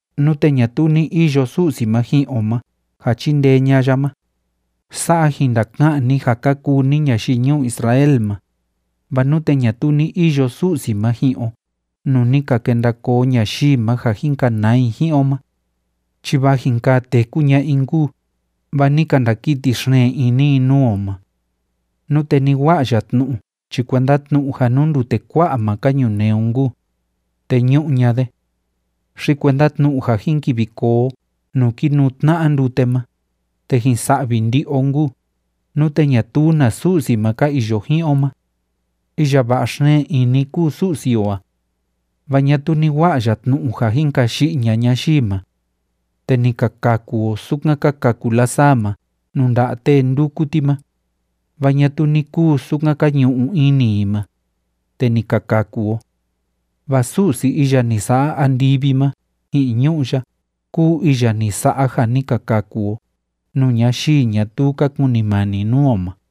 Nute ñatuu ni iyo Su'si ma ji'in o ma ja chindee ña'a ya ma, ―sa'a jin ndaka'an ni ja ka kuu ni ñayii ñuu Israel ma―, vaa nute ñatuu ni iyo Su'si ma ji'in o nuu ni ka kenda koo ñayii ma ja jin kanaa i ji'in o ma, chi vaa jin kaa téku ña'a i nkuu, vaa ni ka ndakiti xeen ini i nuu o ma. Nute ni wa'a ya tnu'u chi kuenda tnu'u ja nuu ndute kua'a ma ka ñunee o nkuu, te ñu'u ña'a de. Xi kuenda tnu'u ja jin kivi koo o nuu kínuu tna'a ndute ma, te jin sa'vi ndi'i o nkuu, nute ñatuu na Su'si ma ka iyo ji'in o ma. Iya va'a xeen ini kúu Su'si o a. Vaa ñatuu ni wa'a ya tnu'u ja jin kayi'i ña'a ñayii ma. Te ni ka kaku o, sukan ka kaku lasaa ma nuu nda'a tee ndúku ti ma, vaa ñatuu ni kuu sukan ka ñu'u ini i ma, te ni ka kaku o. Vaa Su'si iya ni sa'a andivi ma ji'in ñu'ú ya kúu iya ni sa'a ja ni ka kaku o nuu ñayii ñatuu ka kunimani nuu o ma.